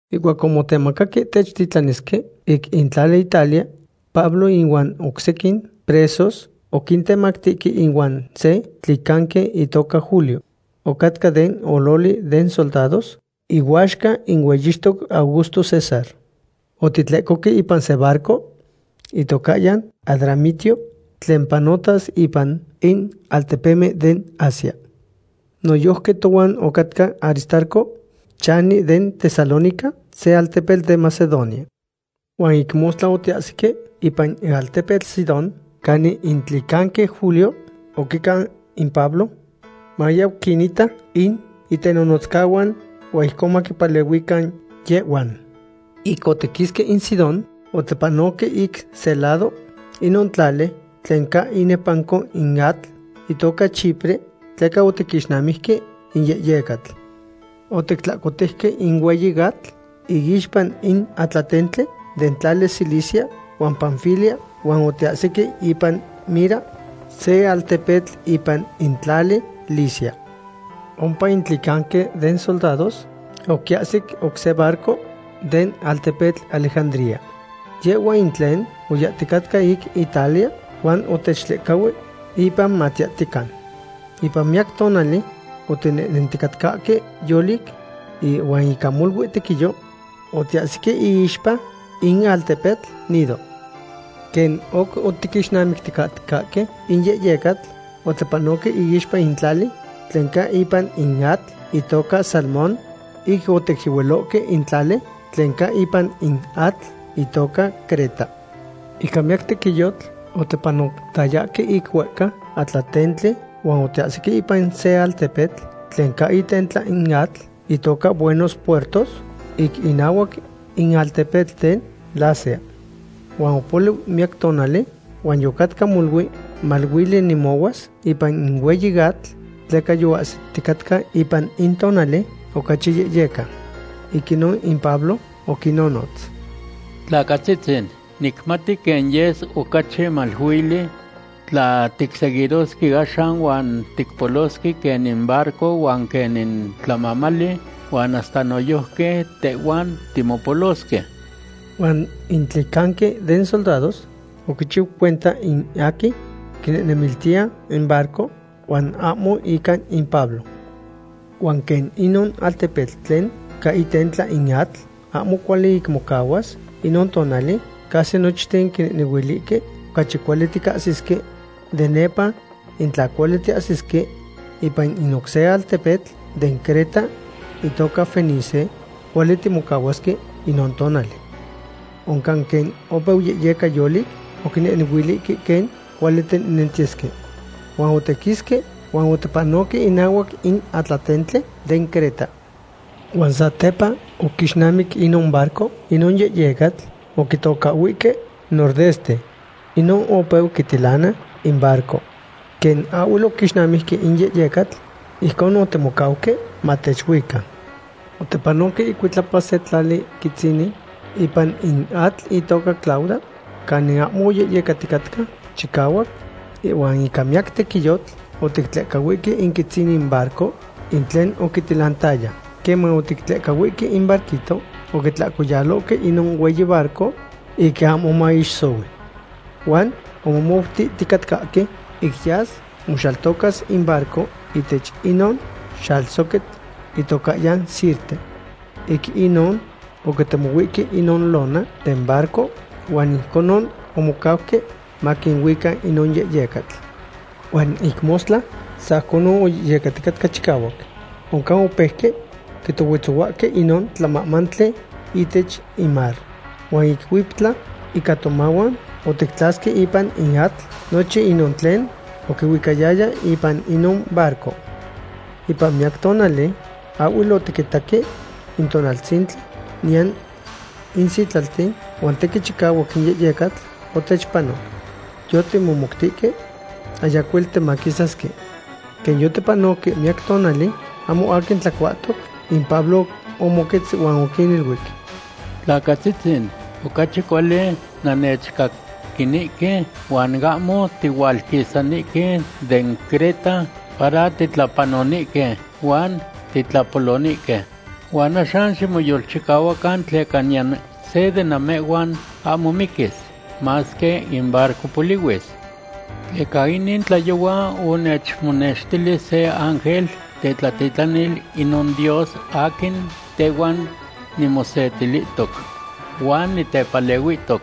Ihcuac omotemacaque techtitlanisque ic in tlali Italia, Pablo inuan oc sequin presos oquintemactihque ihuan se tlicanqui itoca Julio. Ocatca den ololi den soldados ihuaxca in hueyixtoc Augusto César. Otitlecohque ipan se barco itocahyan Adramitio tlen panohtas ipan in altepemen den Asia. Noyojqui tohuan ocatca Aristarco, chani den Tesalónica, se altepetl den Macedonia. Huan ic mostla otiahsique ipan in altepetl Sidón, canin in tlicanqui Julio oquicau in Pablo mayau quinita in itenonotzcahuan, huan ijcon maquipalehuican yehhuan. Ic otiquisque in Sidón, otipanoque ic se lado inon tlali tlen ca inepanco in atl, itoca Chipre, tleca otiquixnamijque in yehyecatl. Otictlahcotejque in hueyi atl iixpa in atlatentli den tlali Cilicia huan Panfilia, huan otiahsique ipan Mira, se altepetl ipan in tlali Licia. Ompa in tlicanqui den soldados oquiahsic oc se barco den altepetl Alejandría. Yehhua in tlen oyahticatca ic Italia, huan otechtlehcahui ipan matiyahtiyecan. Ipan miyac tonali otinehnenticatcahque yolic, huan ica molui tequiyo otiahsique iixpa in altepetl Gnido. Quen oc otiquixnamicticatcahque in yehyecatl, otipanohque iixpa in tlali tlen ca ipan in atl, itoca Salmón, ic oticyehualohque in tlali tlen ca ipan in atl, itoca Creta. Ica miyac tequiyotl otipanotayahque ic huehca atlatentli, huan otiahsique ipan se altepetl tlen ca itentla in atl, itoca Buenos Puertos, ic inahuac in altepetl den Lasea. Huan opoliu miyac tonali, huan yocatca molui maluili nemohuas ipan in hueyi atl, tleca yoahsiticatca ipan in tonali ocachi yehyeca. Ic inon in Pablo oquinnonotz: ―Tlacatzitzin, nicmati quen yes ocachi maluili tla ticseguirosque axan huan ticpolosque quen in barco huan quen in tlamamali huan hasta noyojqui tehhuan timopolosque. Huan in tlicanqui den soldados oquichiu cuenta in aquin quinehnemiltiya in barco huan ahmo ica in Pablo. Huan quen inon altepetl tlen ca itentla in atl ahmo cuali ic mocahuas inon tonali, casi nochten oquinehnehuilihque ocachi cuali tiquisasque de nepa, in tla cuali tiahsisque ipan in oc se altepetl den Creta, itoca Fenice, cuali timocahuasque inon tonali. Oncan quen opeu yehyeca yolic, oquinehnehuilihque quen cuali tinehnentiyesque. Huan otiquisque, huan otipanohque inahuac in atlatentli den Creta. Huan satepa oquixnamic inon barco inon yehyecatl oquitocahhuihque Nordeste. Inon opeu quitilana in barco. Quen ahhuel oquixnamijque in yehyecatl, ijcon otimocauque matechuica. Otipanohque icuitlapa se tlali quitzinin ipan in atl itoca Clauda, canin ahmo oyehyecaticatca chicahuac, huan ica miyac tequiyotl otictlehcahuihque in quitzinin barco in tlen oquitilantaya. Queman otictlehcahuihque in barquito, oquitlahcoyalohque inon hueyi barco ic ahmo maixsohui. Huan omomoutihticatcahque ic yas moxaltocas in barco ihtech inon xalsoquitl itocahyan Sirte. Ic inon oquitemohuihque inon lona den barco huan ijconon omocauque maquinuica inon yehyecatl. Huan ic mostla sajconon oyehyecaticatca chicahuac. Oncan opeuque quitohuetzohuahque inon tlamamali ihtech in mar. Huan ic huiptla ica tomahuan otictlasque ipan in atl nochin inon tlen oquihuicayaya ipan inon barco. Ipan miyac tonali ahhuel otiquitaque in tonaltzintli niyan in sitlalten, huan tequin chicahuac in yehyecatl otechpanoc. Yotimohmoutihque ayacuel timaquisasque. Quen yotipanoque miyac tonali ahmo aquin tlacuahtoc, in Pablo omoquetz huan oquiniluic: ―Tlacatzitzin, ocachi cuali nannechcaquinihque huan ahmo tihualquisanihque den Creta para titlapanonihque huan titlapolonihque. Huan axan ximoyolchicahuacan tleca niyan se de namehhuan ahmo miquis, masque in barco polihuis. Tleca inin tlayohua onechmonextili se ángel tetlatitlanil inon Dios aquin tehuan nimosetilihtoc huan nitepalehuihtoc.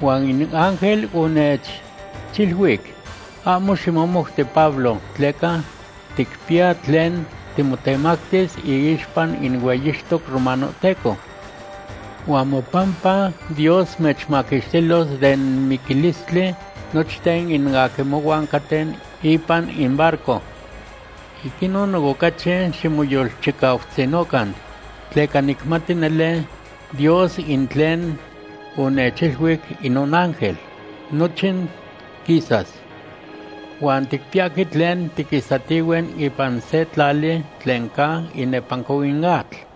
Huan in ángel onechiluic: “Ahmo ximomouti, Pablo, tleca ticpiya tlen timotemactis iixpa in hueyixtoc romanohteco. Huan mopampa Dios mechmaquixtilos den miquilistli nochten in aquin mohuan caten ipan in barco.” Ic inon, ocachi ximoyolchicautzinocan, tleca nicmati nele Dios in tlen onechiluic inon ángel, nochin quisas. Huan ticpiyahque tlen tiquisahtihue ipan se tlali tlen ca inepanco in atl.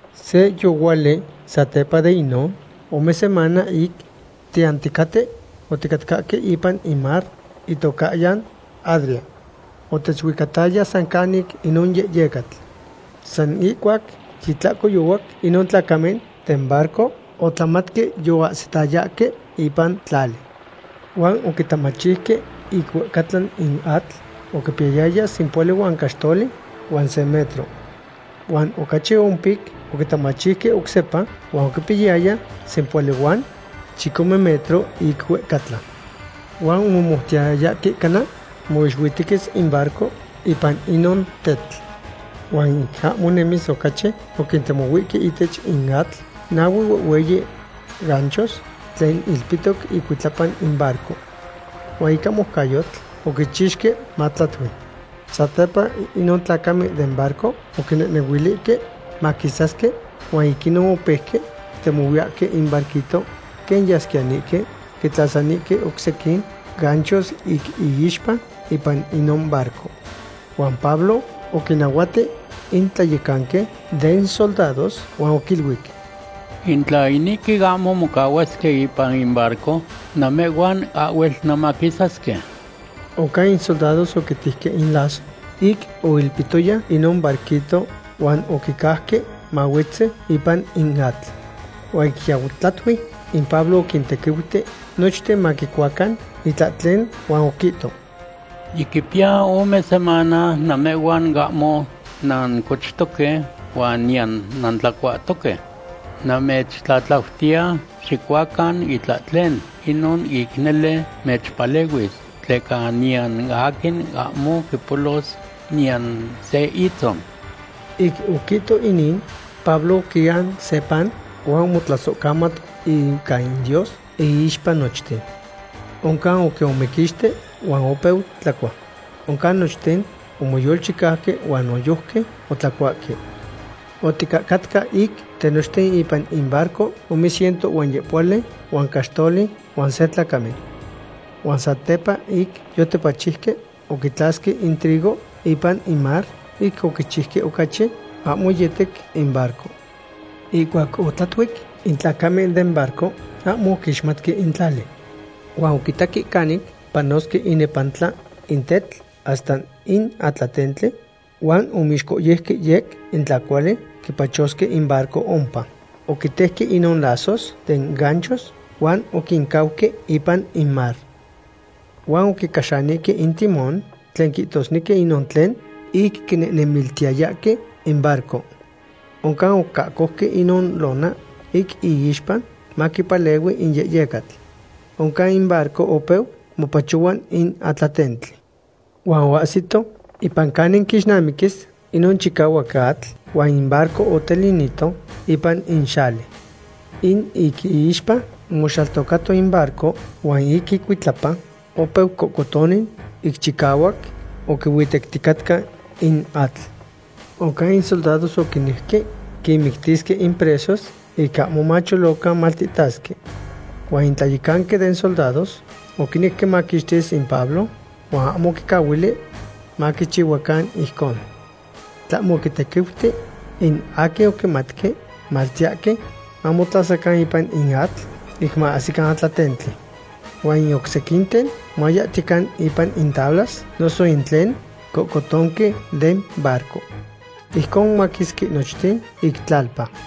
Se yohuali satepa de inon ome semana ic tiyahticaten, oticatcahque ipan in mar itocahyan Adria. Otechuicataya san canic inon yehyecatl. San ihcuac yitlahcoyohuac inon tlacamen den barco otlamatque yoahsitayahque ipan tlali. Huan oquitamachiuque ic huehcatla in atl huan oquipiyayaya sempohuali huan caxtoli huan se metro. Huan ocachi ompic oquitamachiuque oc sepa huan oquipiyayaya sempohuali huan chicome metro ic huehcatla. Huan omomoutiyayahque cana moixuitequis in barco ipan inon tetl. Huan ic ahmo nemis ocachi, oquintemohuihque ihtech in atl nahue huehhueyi ganchos tlen ilpihtoc icuitlapa in barco. Huan ica moucayotl oquichixque matlatui. Satepa inon tlacamen den barco oquinehnehuilihque maquisasque, huan ic inon opeuque quitemohuiyahque in barquito, quen yasquiyanihque quitlasanihque oc sequin ganchos ic iixpa ipan inon barco. Huan Pablo oquinahuati in tlayecanqui den soldados huan oquiluic: ―In tla inihque ahmo mocahuasque ipan in barco, namehhuan ahhuel nanmaquisasque. Oncan in soldados oquitejque in lazo ic oilpihtoyahque inon barquito huan oquicauque mahuetzi ipan in atl. Huan ic yau tlatui, in Pablo oquintequiuti nochten maquicuacan itlahtlen huan oquihto: ―Yiquipiya ome semana namehhuan ahmo nancochtoque huan niyan nantlacuahtoque. Namechtlatlautiya, xicuacan itlahtlen. Inon ic nele mechpalehuis. Tleca niyan aquin ahmo quipolos niyan se itzon. Ic oquihto inin, Pablo oquian se pan huan omotlasohcamat ica in Dios iixpa nochten. Oncan oquiomequixti huan opeu tlacua. Oncan nochten omoyolchicauque huan noyojqui otlacuahque. Oticahcatca ic tinochten ipan in barco ome ciento huan yehpohuali huan caxtoli huan se tlacamen. Huan satepa ic yotipachiuque, oquitlasque in trigo ipan in mar ic oquichiuque ocachi ahmo yetec in barco. Ihcuac otlatuic, in tlacamen den barco ahmo oquixmatque in tlali. Huan oquitaque canic panosque inepantla in tetl hasta in atlatentli, huan omixcohyejque yec in tla cuali quipachosque in barco ompa. Oquitejque inon lazos den ganchos huan oquincauque ipan in mar. Huan oquicaxanihque in timón tlen quihtosnequi inon tlen ic quinehnemiltiyahque in barco. Oncan oquiahcojque inon lona ic iixpa maquipalehui in yehyecatl. Oncan in barco opeu mopachohua in atlatentli. Huan oahsito ipan canin quixnamiquis inon chicahuac atl huan in barco otilinito ipan in xali. In ic iixpa omoxaltocato in barco, huan ic icuitlapa opeu cohcotoni ic chicahuac oquihuitecticatca in atl. Oncan in soldados oquinejque quinmictisque in presos ic ahmo macholocan maltihtasque. Huan in tlayecanqui den soldados oquinec quimaquixtis in Pablo, huan ahmo oquincahuili maquichihuacan ijcon. Tlahmo oquintequiuti in aquin oquimatque maltiyahque mamotlasacan ipan in atl ic maahsican atlatentli. Huan in oc sequinten mayahtiyecan ipan in tablas noso in tlen cohcotonque den barco. Ijcon omaquisque nochten ic tlalpa.